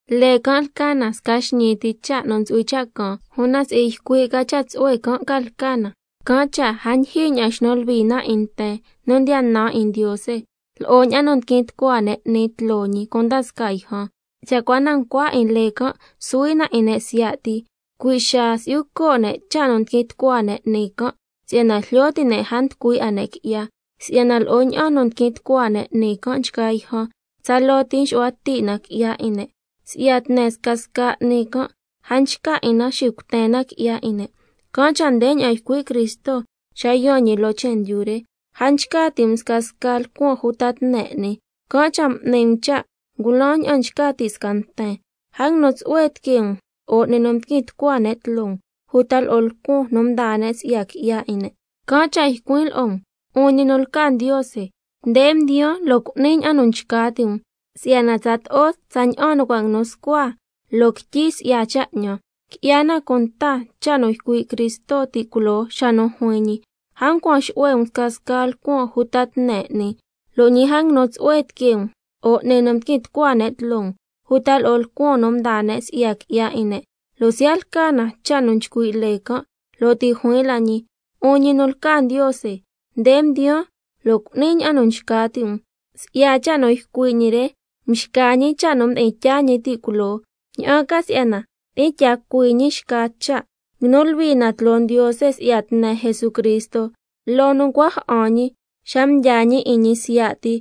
Lee can' lca na sca xñii ti cha' nu ntsu'hui cha' caan, una si'i ycui' ca cha' tsu'hue can' ca lca na, can' cha' a ndyijyi ña'an nxnu luhui na 'in nten nu ndiya nan 'in Ndiose, lo'o ña'an nu ndiquin tucua ne' 'ni tloo ñi cunda scaa yjan. Cha' cua na ncua 'in lee can' suhui na 'in ne' siya' ti, cui' xaa si'yu co' ne' cha' nu ndiquin tucua ne' 'ni can', si'yana jlyo ti' ne' a nducui 'a ne' qui'ya. Si'yana lo'o ña'an nu ndiquin tucua ne' 'ni can' nchgaa yjan, tsaloo ti nxu'hua ti' na qui'ya 'in ne', si'yana tne scasca 'ni can' a nchca 'in na xicuten na qui'ya 'in ne'. Can' cha' ndeña'an ycui' Cristo xa yaan ñi loo chendyu re: —A nchca ti' um scasca lcuan uta tne 'ni, can' cha' m'ni um cha' ngulan ña'an nchca ti' sca nten. A nguinu tsu'hue tiquee um lo'o 'ni nu mdiquin tucua ne' tloo um, uta lo'o lcuan nu mdaa ne' si'ya qui'ya 'in ne'. Can' cha' ycuin' lo'o um: 'Un ñi nu lca Ndiose, nde mdiyaan lo' cu'nin ña'an nu nchca ti' um si'yana tsato'o tsaña'an cha' nu cua' nguinu scua loo quityi si'ya cha' 'ñan—. Qui'ya na cunta cha' nu ycui' Cristo ti' culoo xa nu juin ñi: A ncuan xu'hue um scasca lcuan uta tne 'ni, lo' ñi a nguinu tsu'hue tiquee um lo'o 'ni nu mdiquin tucua ne' tloo um, uta lo'o scasca lcuan nu mdaa ne' si'ya qui'ya 'in ne', (lo' siya' lca na cha' nu nchcui' lee can'), lo' ti' juin la ñi: 'Un ñi nu lca Ndiose, nde mdiyaan lo' cu'nin ña'an nu nchca ti' um. Si'ya cha' nu ycui' ñi re mxca ñi cha' nu mdi'in tyaa ñi ti' culoo, ña'an ca si'yana tyi'in tya cui ñi xca cha'. Nguinu luhui na tloo Ndiose si'ya tne Jesucristo loo nu ncua ja'an ñi xa mdyaa ñi 'in ñi siya' ti,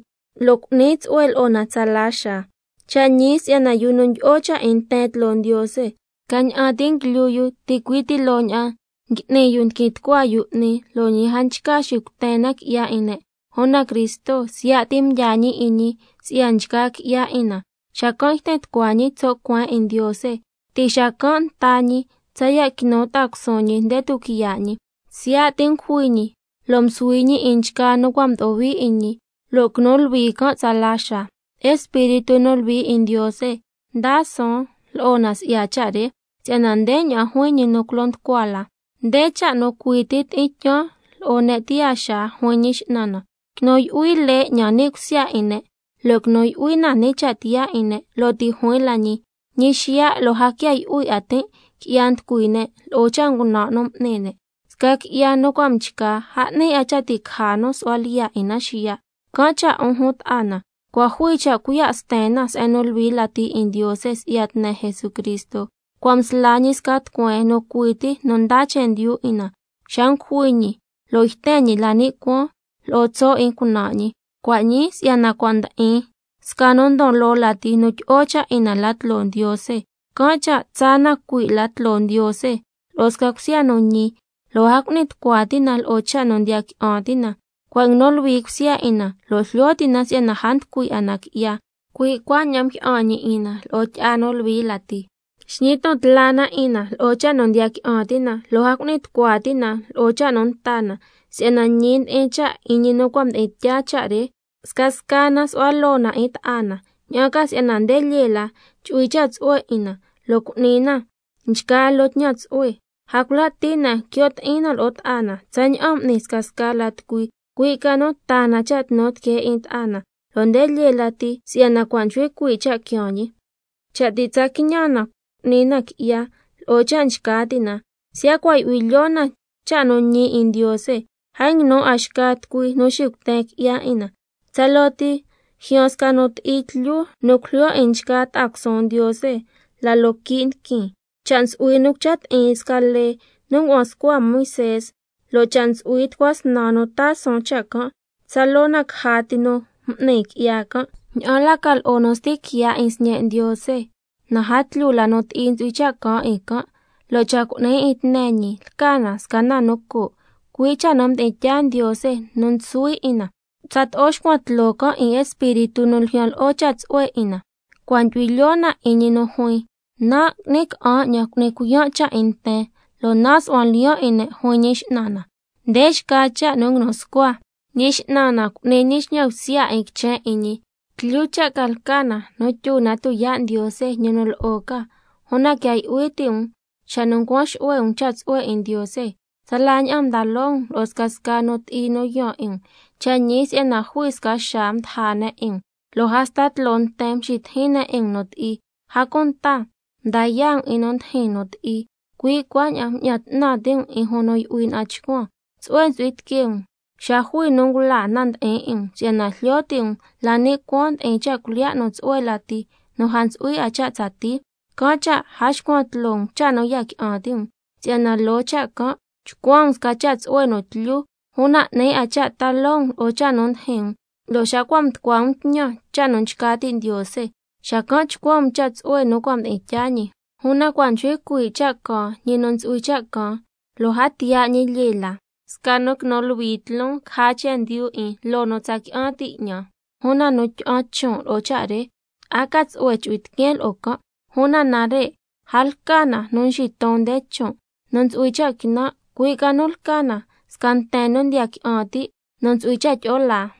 lo' cu'ni tsu'hue lo'o na tsalaxaa. Cha' ñi si'yana yu nu ndyi'o cha' 'in nten tloo Ndiose, scaña'an ti nguilyu yu ticui' ti loo ña'an ngui'ni yu ndiquin tucua yu 'ni, lo' ñi a nchca xicuten na qui'ya 'in ne'. Una Cristo siya' ti mdyaa ñi 'in ñi si'ya nchgaa qui'ya 'in na, xacan' yten tucua ñi tso' cueen 'in Ndiose. Ti' xacan' nta ñi —tsaya' quinu ta'a cusuun ñi nde tuquiya' ñi—, si'yana siya' ti ngujui ñi lo' msuhui ñi 'in nchgaa nu cua' mdo'o hui 'in ñi, lo' quinu luhui can' tsala xaa. Espíritu nu Luhui 'in Ndiose ndaa suun lo'o na si'ya cha' re, si'yana ndeña'an juin ñi culo nducua la: —Nde cha' nu cui ti tyi'in tyaan lo'o ne' tiyaa xaa, juin Ñi X'nan na: Quinu yu'hui lee 'ñan ni' cusya 'in ne', lo' quinu yu'hui na ni' cha' tiyaa 'in ne'—. Lo' ti' juin la ñi: —Ñi xiya' lo' a quia yu'hui 'a tin' qui'ya nducui ne' lo'o cha' ngunan' nu m'ni ne'—. Sca qui'ya nu cua' mchca, a 'ni 'a cha' ti' caja nu su'hua lyiya' 'in na xiya'. Can' cha', 'un jun ta'a na, cua' jui cha' cuiya' sten na Se'en nu Luhui Lati 'in Ndiose si'ya tne Jesucristo, cua' msla ñi sca tucueen nu cui ti nu ndaa chendyu 'in na, xa ngujui ñi lo' yten ñi la ni' cuaan lo'o tso' 'in cunan' ñi. Cua' ñii si'yana cua' ndi'in sca nu ndon loo lati nu tyi'o cha' 'in na la tloo Ndiose, can' cha' tsaa na cui' la tloo Ndiose lo'o sca cusya nu ñi, lo' a cu'ni tucua ti' na lo'o cha' nu ndiya qui'an ti' na, si'yana cua' nguinu luhui cusya 'in na lo' jlyo ti' na si'yana a nducui 'a na qui'ya, cui' cuaña'an mjyi'an ñi 'in na lo'o tyi'a nu luhui lati. Xñi ton tla na 'in na lo'o cha' nu ndiya qui'an ti' na, lo' a cu'ni tucua ti' na lo'o cha' nu nta na, si'yana ñi ndi'in cha' 'in ñi nu cua' mdi'in tyaa cha' re. Scasca na su'hua loo na 'in ta'a na, ña'an ca si'yana nde lyee la chu'hui cha' tsu'hue 'in na, lo' cu'ni na nchgaa loo tñan tsu'hue. A cula' ti' na quio' ti'in na lo'o ta'a na, tsaña'an n'ni scasca la tucui, cui' ca nu taa na cha' tnu tiquee 'in ta'a na, lo' nde lyee lati si'yana cua' nchcui cuii' cha' quiaan ñi. Cha' ti' tsa quiñan na cu'ni na qui'ya lo'o cha' nchca ti' na, siya' cua' yu'hui lyoo na cha' nu ñi 'in Ndiose, a nguinu 'a xca tucui nu xicuten qui'ya 'in na, tsaloo ti ljyaan sca nu ti'i tlyu nu cujlyo 'in nchgaa ta'a cusuun Ndiose la loo quii' ndiquin. Cha' ntsu'hui nu cucha ti'in sca lee nu ngua'an scua Moisé, lo' cha' ntsu'hui —tucua snan nu taa suun cha' can'—, tsaloo na caja ti nu m'ni qui'ya can'. Ña'an la ca lo'o nu sti quiya' 'in Sñe' Ndiose, na a tlyu la nu ti'i ntsu'hui cha' caan 'in can', lo' cha' cu'ni 'in tne ñi lca na sca na nu coo', cui' cha' nu mdi'in tyaa Ndiose nu suhui 'in na, tsato'o xcuan tloo can' 'in Espíritu nu ljyan lo'o cha' tsu'hue 'in na. Cua' ndyu'hui lyoo na 'in ñi nu juin: —Nan' ngui'ni ca'an 'ñan xitucuin nu ti'i can', nan' xu'huan lyiyan' 'in ne', juin Ñi X'nan na—. Nde xca cha' nu nguinu scua: —Ñi X'nan na cu'ni ñi xñan bsya 'in quichen 'in ñi—. ¡Tlyu cha' ca lca na nu tyu na tuyaa' Ndiose, ñi nu lo'o ca! Una quia yu'hui ti' um xa nu ncuan xu'hue um cha' tsu'hue 'in Ndiose, tsala ña'an mda loo um lo'o scasca nu ti'i yaan 'in um. Cha' ñi si'yana jui sca xaa mdaja ne' 'in um, lo' hasta tloo nten mxitijin ne' 'in um nu ti'i, a cunta mda yaa' um 'in nu ndijin nu ti'i. Cui' cuaña'an mña'an 'tnan ti' um 'in jun nu yu'hui na'an chcuan, tsu'hue ntsu'hui tiquee um xa jui nu ngulaa na nu ndi'in 'in um, si'yana jlyo ti' um la ni' cuaan ndi'in cha' cuilyiya' nu tsu'hue lati nu a ntsu'hui 'a cha' tsatii. Can' cha' a xcuan tloo um cha' nu ya qui'an ti' um, si'yana loo cha' can' chcuan um sca cha' tsu'hue nu tlyu, una 'ni 'a cha' ta loo um lo'o cha' nu ndijin um, lo' xa cua' mducua um tñan cha' nu nchca ti' Ndiose, xacan' chcuan um cha' tsu'hue nu cua' mdi'in tyaa ñi. Una, —cua' nchcui cuii' cha' caan ñi nu ntsu'hui cha' caan, lo' a tiya' 'a ñi lyee la. Sca nu quinu luhui tloon caja chendyu 'in loo nu tsa qui'an ti' 'ñan. Una nu tyi'an chon' lo'o cha' re, a ca tsu'hue chu'hui tiqueen lo'o can'—. Una nare' a lca na nu nxiton nde chon' nu ntsu'hui cha' quinan', cui' ca nu lca na sca nten nu ndiya qui'an ti' nu ntsu'hui cha' tyi'o laa.